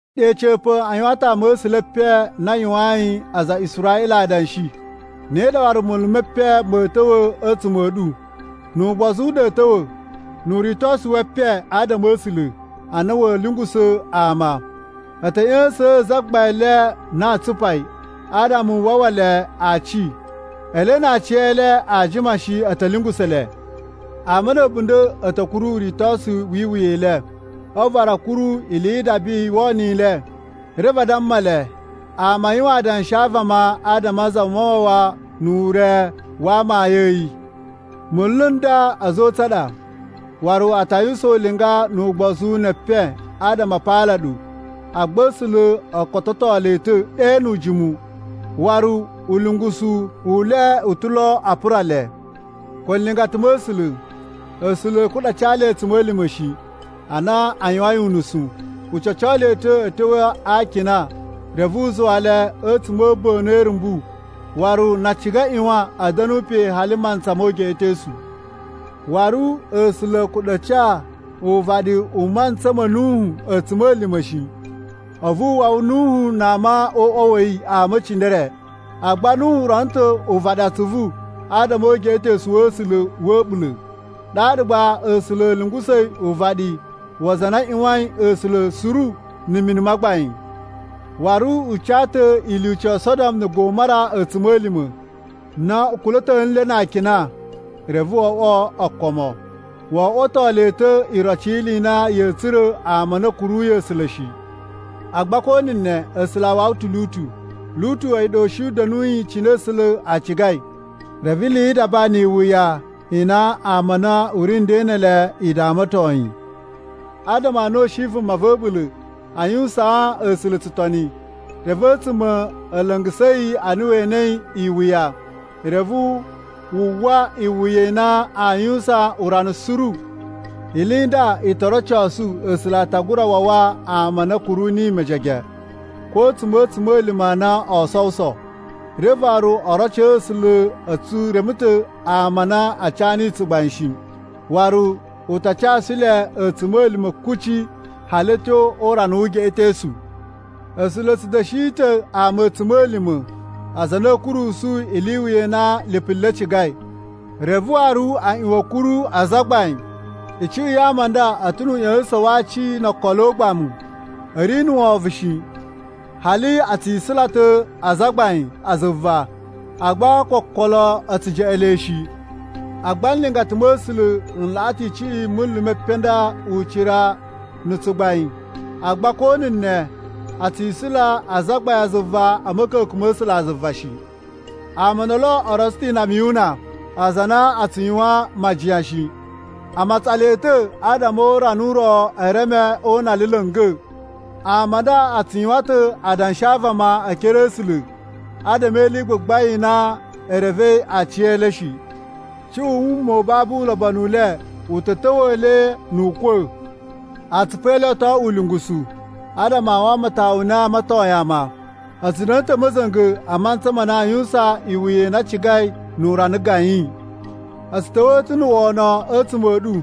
Ɗe a̱ca̱pa̱ a yuwan ta̱ ama̱sula̱ e epen a na a yuwayin aza a Israꞌila adanshi, ne ɗa waru munlu me epen ma̱a̱ ta̱wa̱ a̱tsuma̱ a̱ ɗu. Nu ugbozu u ɗa a̱a̱ ta̱wa̱ nu uritosu we epen adama a̱ A̱sula̱ a na wa̱a̱ lungusa̱ ama. A̱ ta̱ ꞌya̱sa̱a̱n Zagbain le na tsupai adama u wawa le aci. Ele na aciyele aa jima shi a̱ ta̱ lungusa̱ le. Ama na̱ a̱bunda̱ a̱ ta̱ kuru uritosu wi iwuya i le. A̱vu waru a̱ kuru ili yi idaba i wono i le. Reve adama e le ama a yuwan adanshi a vama adama a Zamawawa nu ure wa amayun a̱ yi. Munlu n nda a̱za̱ o utsa̱n a ɗa, waru a ta yuwusan ulinga nu ugbozu ne epen adama a paala ɗu. Agba A̱sula̱ o kototo le ta̱ ɗe nu ujimu, waru ulungusu u le u ta̱ lo a pura le. Ko nlingata ma̱ A̱sula̱, A̱sula̱ a̱ kuɗa̱ a ca le a̱tsuma̱lima̱ shi, ana a yuwain unusu. U ca̱co le ta̱ a̱ tyo a akina reve u zuwa le a̱tsuma̱ a̱ a̱a̱ba̱nu e irumbu. Waru na a ciga a ꞌyuwan a̱ da̱nu pe hali mantsa mo ugeꞌetosu. Waru A̱sula̱ a̱ kuɗa̱ a ca uvaɗi u mantsa ma̱ Nuhu a̱tsuma̱lima̱ shi. A̱vu u wawa Nuhu na ama o uꞌwa wa̱ yi ama e cindere. Agba Nuhu rono ta̱ uvaɗi atsuvu adama o ugeꞌetosu wa̱ A̱sula̱ wa̱ a̱ɓula̱. Ɗaɗa gba A̱sula̱ a̱ lungusa̱i uvaɗi wa aza a na a ꞌyuwain A̱sula̱ suru na̱ mini ma gbain. Waru u ca ta̱ ilyuci yo Sodom na̱ Gomora a̱tsuma̱lima̱ na u kula̱to nle na akina reve o oꞌwo okomo. Wo oꞌwoto le ta̱ iroci yi ili i na ya̱a̱ tsura̱ ama a na a̱ kuruyi A̱sula̱ shi. Agba ko na̱ ne, A̱sula̱ a wawa ta̱ Lutu. Lutu a̱yi ɗa u shi u da̱nuyi cine A̱sula̱ a cigai, reve ili yi idaba ni iwuya i na ama a na u ri nden ne ele i damaton yi. Adama a na u shi vuma va̱ a̱ɓula̱ a yuwusaan A̱sula̱ tsutoni, reve a̱tsuma̱ a̱ la̱nga̱sa̱ yi ana we enei iwuya, reve wu uwwa iwuya i na aa yuwusan urana suru. Ili i nda i to rocosu A̱sula̱ a ta gura wawa ama a na a̱ kuru niyi mejege ko a̱tsuma̱ a̱ a̱tsuma̱lima̱ a na oo sowuso. Reve waru o roco A̱sula̱ a̱ tsu reme ta̱ ama a na a ca niyi tsugbain shi. Waru u ta casu le a̱tsuma̱lima̱ kuci hali a̱ tyo o urana wu ugeꞌetosu. A̱sula̱ a̱ tsu da̱shi ta̱ ama a̱tsuma̱lima̱, aza a na a̱a̱ kurusu ili i iwuya i na lipu le cigai, reve waru a ꞌyuwan a̱ kuru azagbain. Icuꞌun ya ama a nda a̱ ta̱ nu uꞌya̱sa̱sa̱n wa aci no okolo o ugbamu. A̱ ri na̱ wovon shi, hali a tsi isula ta̱ azagbain a zuva, agba ko okolo a̱ tsu jeꞌen le shi. Agba nlingata ma̱ A̱sula̱ n laꞌa ta̱ icuꞌun i munlu me epen a nda ucira na̱ tsugbain. Agba ko na̱ ne, a tsi isula azagbain a zuva a̱ ma̱ka̱ka̱n ma̱ A̱sulazuva shi. Ama o ndolo o rotso ta̱ inama yu una, aza a na a tsu yuwan majiyan shi. A matsan le ta̱ adama o urana u ro e reme o una le la̱nga̱. Ama a nda a tsu yuwan ta̱ adanshi a vama e ekere a̱ A̱sula̱ adama e ili i gbagbain i na e revei aciyele shi. Cuꞌun wuma babu ulobonu u le u ta̱ ta̱wa̱a̱ le nu ukwa̱. Atsupu e le o to oꞌwo ulungusu adama a wamatowun u na a amatoyin ama. A̱ tsu da̱na̱ ta̱ a̱ ma̱za̱nga̱ a mantsa ma na aa yuwusan iwuya i na a cigai nu urana gayin. A̱ tsu ta̱wa̱a̱ ta̱ na̱ wono a̱tsuma̱ a̱ ɗu,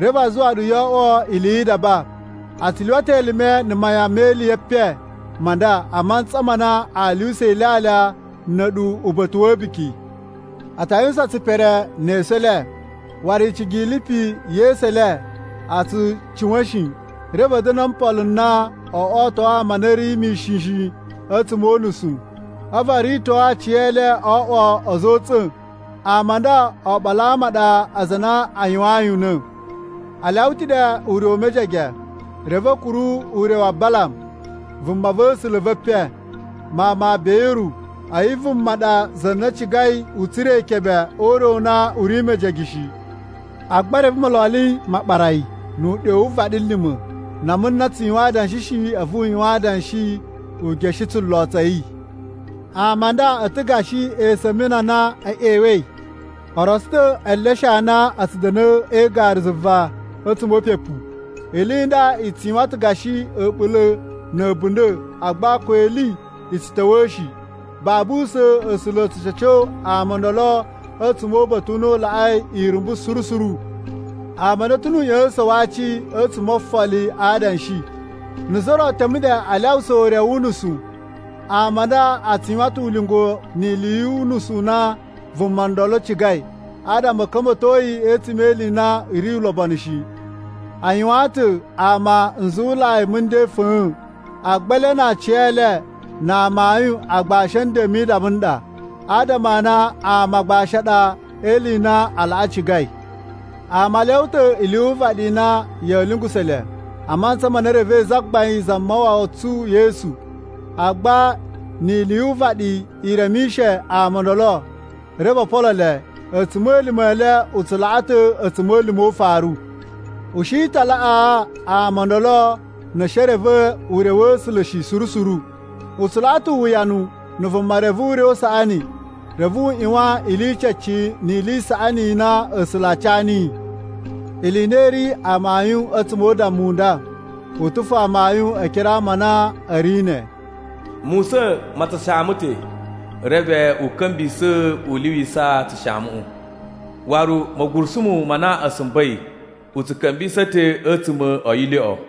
reve a zuwa ɗu yoo oꞌwo ili yi idaba. A tsu lyuwa ta̱ elime na mayan me ili ye epen ma nda a mantsa ma na a lyuwusa ilyalya na̱ a̱ɗu uba̱ta̱ wa̱ a̱buki. A ta yuwusan tsipere ne esu e le, waru icigi i lipu ye esu e le a̱ tsu cuwa̱n shi. Reve a̱ da̱na̱ o mpolo n na o oto ama a na a̱ ri mishin shi a̱tsuma̱ o unusu. A̱vu o rito aciyele o oꞌwo a̱za̱ o utsa̱n. Ama a nda oɓolo a ama a ɗa aza a na a yuwayin una̱. A lyawa ta̱ ɗe ure u mejege, reve a̱ kuru ure wa Balam vumava̱sula̱ ve epen, mawun ma Beyuru. A̱yi vuma ɗa za na cigai u tsura̱ ikebe o ure u na u ri mejege shi. Agba reve mololi ma ɓara yi nu uɗyo wu vaɗilima̱. Nama na tsu yuwan adanshi shi, a̱vu u yuwan adanshi u geshe tsulo tsa̱ yi. Ama a nda a̱ ta̱ gashi esumini a na e ꞌyewei. O rotso ta̱ eleshe a na a̱ tsu da̱na̱ e igaru zuva a̱tsuma̱ o upepu. Ili i nda i tsu yuwan ta̱ gashi a̱ɓula̱ na̱ a̱bunda̱ agba ko ili a̱ tsu ta̱wa̱a̱ shi. Babu usa̱n A̱sula̱ a̱ ta̱ ca̱co ama o ndolo a̱tsuma̱ o uba̱ta̱ u na u laꞌai irumbu suru suru. Ama a nda a̱ ta̱ nu uꞌya̱sa̱sa̱n wa aci a̱tsuma̱ o ofoli a adanshi. Na̱ za ro teme ɗe a lyawusa ure wu unusu, ama a nda a tsu yuwan ta̱ ulinga ni ili yu unusu u na vuma ndolo cigai adama a̱ ka̱mba̱to yi a̱tsuma̱ e ili i na i ri ulobonu shi. A yuwaan ta̱ ama nzuwulai mu nden fa̱a̱n. Agba ele na aciyele na amayun agbashi a̱ nden mi idaba n ɗa, adama a na ama agbashi a ɗa e ili i na a laꞌa cigai. Ama a lyawa ta̱ ili yu uvaɗi i na ya̱a̱ lungusa̱ le, a mantsa ma na e revei Zagbain Zamawawa tsu Yesu. Agba ni ili yu uvaɗi i remishe ama o ndolo reve o polo le, a̱tsuma̱lima̱ e le u tsu laꞌa ta̱ a̱tsuma̱lima̱ o ufaru. U shi ta laꞌaa ama o ndolo na̱ a̱ shi e reve ure wa̱ A̱sula̱ shi suru suru. U tsu laꞌa ta̱ uwuyanu na̱ vuma reve ure u saꞌani, reve u ꞌyuwan ili i cece ni ili i saꞌani i na A̱sula̱ a ca niyi. Ili i na i ri amayun a̱tsuma̱ o udammu u nda, u ta̱ fo amayun e ekere a ama a na a̱ ri ne: “Musa̱n ma tsu shaama ta̱, reve u ka̱mbisa̱ u lyuwisa tsushaamuꞌu.” Waru, “Ma̱gurusumu ma na a̱ sumba̱i, u tsu ka̱mbisa̱ ta̱ a̱tsuma̱ o yilyoꞌo.”